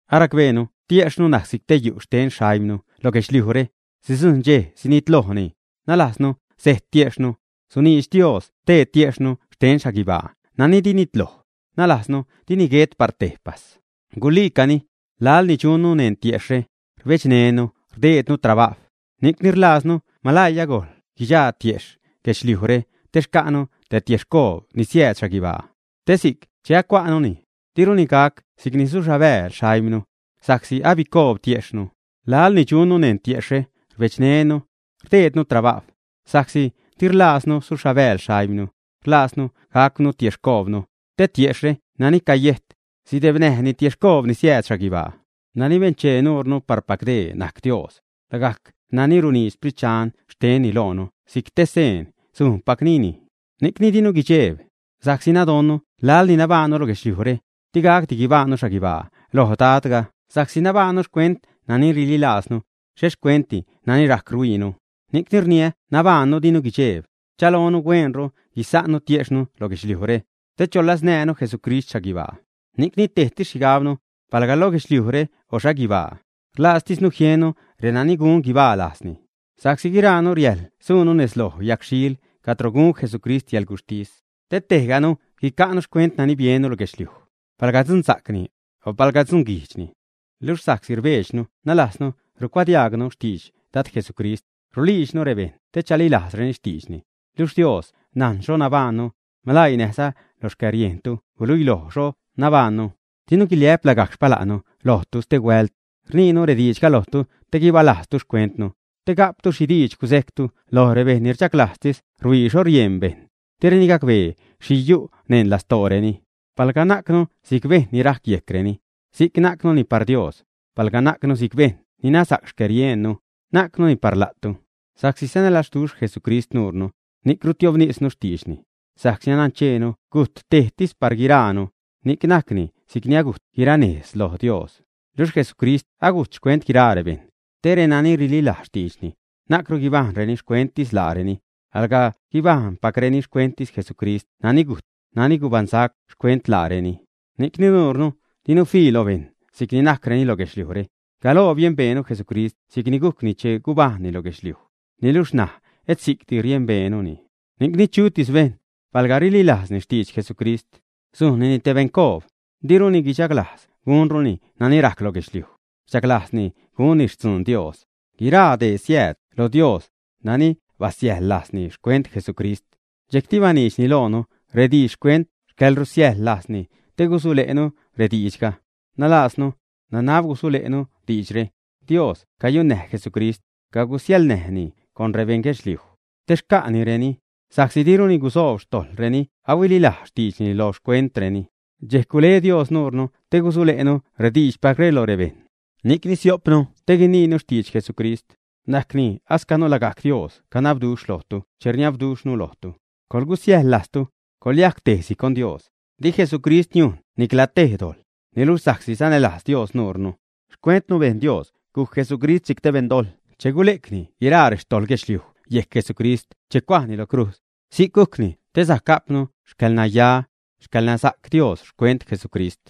Aracbeenu tiejxhnu najc si'c te yu' xten xaimnu lo guedxliujre, sidzujṉ dxej sinitlojni, nalajznu sejt tiejxhnu, suniidx Dios te tiejxhnu xten xhaguibaa nani di nitloj, nalajznu dini guet par tejpas. Guliicani, laḻni dxunnu neṉ tiejxhre, rbedxneṉnu rdeednu trabajw, ni'cni rlajznu maläii agojl guidxaa tiejxh guedxliujre te xca'nu te tiexhcoob ni siääd xhaguibaa. Te si'c che acua'nuni, diruni gac si'cni suxhabääl xaimnu, sa'csi abicoob tiexhnu. Laḻni dxunnu neṉ tiejxhre rbedxneṉnu, rdeednu trabajw, sa'csi di rlaaznu suxhabääl xaimnu, rlajznu gacwnu tiexhcoobnu, te tiejxhre nani cayejt, sidebnäjni tiexhcoob ni siääd xhaguibaa. Nani benchee nuure parpac dee najc Dios, lagajc nani runiidx Sprit Dxan xtenni loonu si'c te seen sujnpacnini. Ni'cni dinu guidxeeb, sa'csi nadonnu laḻni nabajṉnu lo guedxliujre, di gacdi guibajṉnu xhaguibaa loj Dadga. Sa'csi nabajṉnu xcuent nani rililajznu, xhet xcuentdi nani rajc rhuiinu. Ni'cni rniä nabajṉnu dinu guidxeeb, rchaloonu hueenru guisa'nnu tiejxhnu lo guedxliujnure, te choläznäänu Jesucrist xhaguibaa. Ni'cni tejtis najc xhigabnu, palga lo guedxliujre o xhaguibaa, rlajztisnu jiennu renani gun guibaa lajzni. Sa'csi guiraanu riäjḻ suunu nez loj yagxhiil cadro gun Jesucrist yäḻguxhtis, te tejganu guica'nu xcuent nani biennu lo guedxliuj, palga dzunsa'cni, o palga dzunguijdxni. Luxh sa'csi rdxejbnu (nalajznu rucuadiaagnu xtidx) Dad Jesucrist, ruliidxnu rebejṉ te chalilajzreni xtiidxni. Luxh Dios najn xho nabajṉnu; maläii näjza lo xcäriejntu guluiloj xho nabajṉnu. Dinu guiliä'p lagajc xpala'nnu lojtu stehuält, rniinu rediidxga lojtu te guibalajztu xcuentnu, te ga'ptu xhi diidx gusejctu lo rebejṉ ni rchaglajztis ruhuii xho rieṉ bejṉ, direni gacbee xhi yu' neṉ lastooreni. Palga najcnu si'c bejṉ ni rajc yejcreni, si'c najcnu par Dios, palga najcnu si'c bejṉ ni nasa'c xcäriejnnu, najcnuni par la'tu. Sa'csi sanälazduxh Jesucrist nuure, ni'c rusoobtisnu xtiidxni, sa'csi nancheenu gujt tejtis par guiraanu, ni'c najcni si'cni agujt guiraanu nez loj Dios. Luxh Jesucrist gujt xcuent guiraa rebejṉ, te renani rililajz xtiidxni, na'cru guibajṉreni xcuenttis laareni, alga guibajṉpacreni xcuenttis Jesucrist nani gujt, nani gubaṉsac xcuent laareni. Ni'cni nuure dinu fii lo bejṉ si'cni najcreni lo guedxliujre. Galoo biembeenu Jesucrist si'cni gujcni che gubajṉni lo guedxliuj, niluxh ṉaj et si'cti riembeenuni. Ni'cni chutis bejṉ, palga rililajzni xtidx Jesucrist, sujnnini te beṉcoob, diruni guichaglajz gunruni nani rajc lo guedxliuj, alga guichaglajzni gunni xtzun Dios. Guiraa dee siääd lo Dios, nani basiäjḻ lajzni xcuent Jesucrist, dxejcti baniidxni loonu rediidx xcuent xcäḻrusiäjḻ lajzni te gusule'nu rediidxga, nalajznu, nanab gusule'nu diidxre: Dios guyunäj Jesucrist, cagusiäjḻlajzni con rebeṉ guedxliuj, te xca'nireni, sa'csi diruni gudzuub xtojḻ reni ahuililajz xtiidxni lo xcuentreni. Dxejc gule Dios nuure te gusule'nu rediidxpacre lo rebejṉ. Ni'cni sio'pnu te guiniinu xtidx Jesucrist, najcni ascanu lagajc Dios canabduxh lojtu che rniabduxhnu lojtu, coḻgusiäjḻ lajztu, coḻyajc tejsi con Dios. Di Jesucrist niujn nicla tej dojḻ, niluxh sa'csi sanälajz Dios nuunu, xcuentnu bejn Dios gujc Jesucrist si'c te beṉdojḻ che gule'cni guiraa rextojḻ guedxliuj yejc Jesucrist che cuajni lo crujz. Si'c gujcni te sajc ga'pnu xcäḻnaya, xcäḻnasa'c Dios xcuent Jesucrist.